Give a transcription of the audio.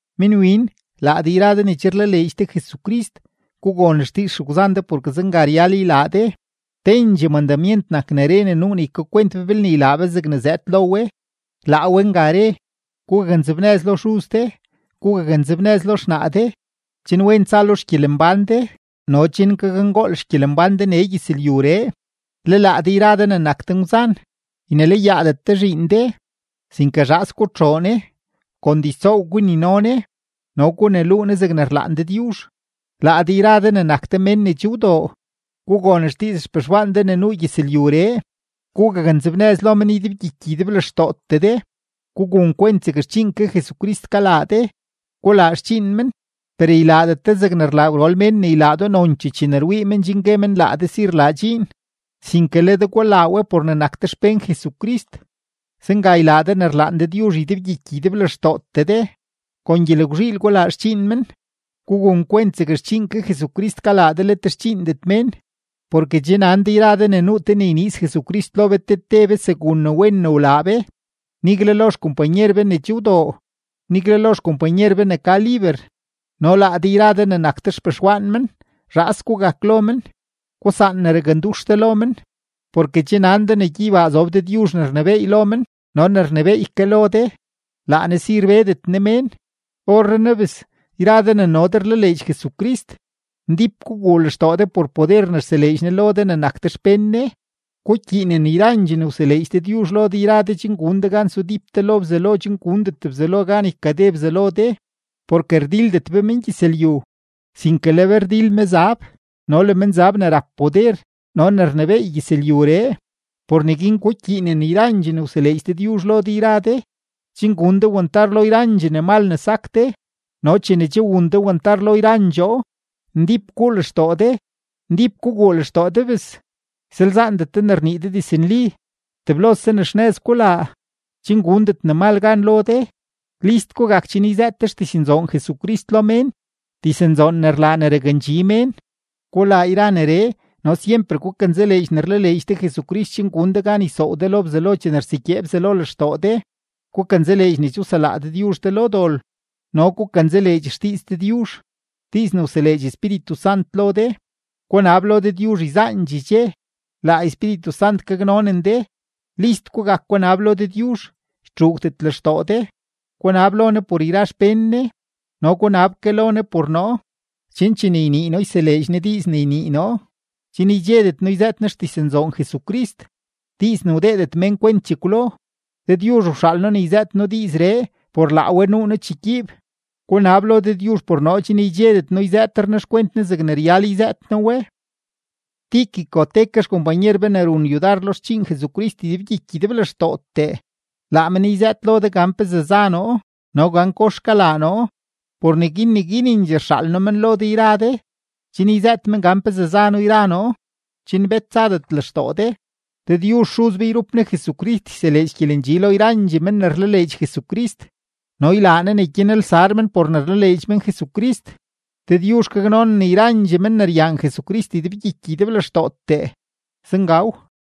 Minwin, laa de yra de ne che rlaleedx de Jesucrist, gugon xdiiz xegwzan de porke zenga ryal ylaa de. Tendxee mandamyent nak ne re ne nuu ne ykakwent be belne ylaa be zegne zëëd lo we, laa we nga re: “Gugaknzebnëz lo xuz de, gugaknzebnëz lo xnaa de, chen wen tsa lo xgyelembán de no chen gakngool xgyelembán de nee gyëzlyuree.” Le laa de yra de ne nak de ngwzan, ynelayaadet de zhiin de, sinke zhaas gutxoo ne, kon diztsoow gunino ne no guneluu ne zegne rlaan Dëdyuzh. Laa de yra de ne nak de mén ne che wdoo, gugon xdiiz xpexwaan de ne nuu gyëzlyuree. Gugaknzebnëz lo men ydebgyiky ydeblextootee de; gugun kwent zeg xdxiin ke Jesucrist kalaa de. Gulaa xdxiin men, per ylaadet de zegne rlaa gwrol mén ne ylaa do nonchee chene rwii men chen gue men laa de si rlaa dxiin, sinke le de gulaa we por ne nak de xpén Jesucrist, zenga ylaa de ne rlaan Dëdyuzh ydebgyiky ydeblextootee de. Kon gyelgwzhiil gulaa xdxiin men, gugun kwent zeg xdxiin ke Jesucrist kalaa de let xdxiindet mén. Porke che nan de yra de ne nuu te ne yniiz Jesucrist lo be te te be segun ne wen ne wlaa be, nigle lo xkompanyer be ne che wdoo, nigle lo xkompanyer be ne ka liber. No laa de yra de ne nak de xpexwaan men, zhaas gugak lo men, gusaan ne rakndux de lo men. Porke che nan de ne gyeybaa zob Dëdyuzh ne rnebééy lo men no ne rnebééy ke lo de, laa Ne si rbedet Ne mén. Orrenaa bes, yra de ne no de rlaleedx Jesucrist, ndíp guguu lextoo de por poder ne rseleedx Ne lo de ne nak de xpén Ne. Gukyiinen yrandxee ne wseleedx Dëdyuzh lo de yra de chen gun de gan sudíp de lo Bzelo chen gundet Bzelo gan ykade Bzelo de. Porke rdildet be mengyëzlyu, sinke le be rdil mezab no le menzab ne rap poder no ne rnebééy gyëzlyuree. Por neguin gukyiinen yrandxee ne wseleedx Dëdyuzh lo de yra de, chen gun de wantar lo yrandxee ne mal ne sak de, no chene che wun de wantar lo yrandxoo, ndíp guu lextoo de. Ndíp guguu lextoo de bes, ysalzaandet de ne rnii de diznli. Teblose ne xnëz gulaa, chen gundet ne mal gan lo de. List gugak chen yzëët de xdiznzoon Jesucrist lo mén, diznzoon ne rlaa ne rakndxi mén. Gulaa yra neree no syemper gukanzaleedx ne rlaleedx de Jesucrist chen gun de gan ysoow de lo Bzelo chene rsegyee Bzelo lextoo de. Gukanzaleedx ne che wselaa Dëdyuzh de lo dol, no gukanzaleedx xdiiz Dëdyuzh, diiz ne wseleedx Espíritu Sant lo de. Gunab lo Dëdyuzh yzaandxee dxe, laa Espíritu Sant gaknonen de. List gugak gunab lo Dëdyuzh, ytxuugdet lextoo de, gunab lo Ne por yra xpén Ne. No gunab ke lo Ne por noo, chen chene ynii noo yseleedx Ne diiz ne ynii noo, chen ydxedet noo yzëët noo xdiznzoon Jesucrist diiz ne wdeedet mén kwent chekwlo. Dëdyuzh wxaal noo ne yzëët noo diizree, por laa we nuu noo chegyiib. Gunab lo Dëdyuzh por noo chen ydxedet noo yzëëtre noo xkwent Ne zegne ryal yzëët noo we. Tíquico te ke xkompanyer be ne run yudar lo xdxiin Jesucrist ydebgyiky ydeblextootee, laa men yzëët lo de gan pezee za noo no gan kox kalaa noo. Por neguin neguinendxee rxaal noo men lo de yra de, chen yzëët men gan pezee za noo yra noo, chen bet tsadet lextoo de. Dëdyuzh Xuz be yrup Ne Jesucrist yseleedx gyelendxi lo yrandxee men ne rlaleedx Jesucrist, no ylaa Ne ne gyanelsar men por ne rlaleedx men Jesucrist. Dëdyuzh gaknonen yrandxee men ne ryaan Jesucrist ydebgyiky ydeblextootee. Zengaw.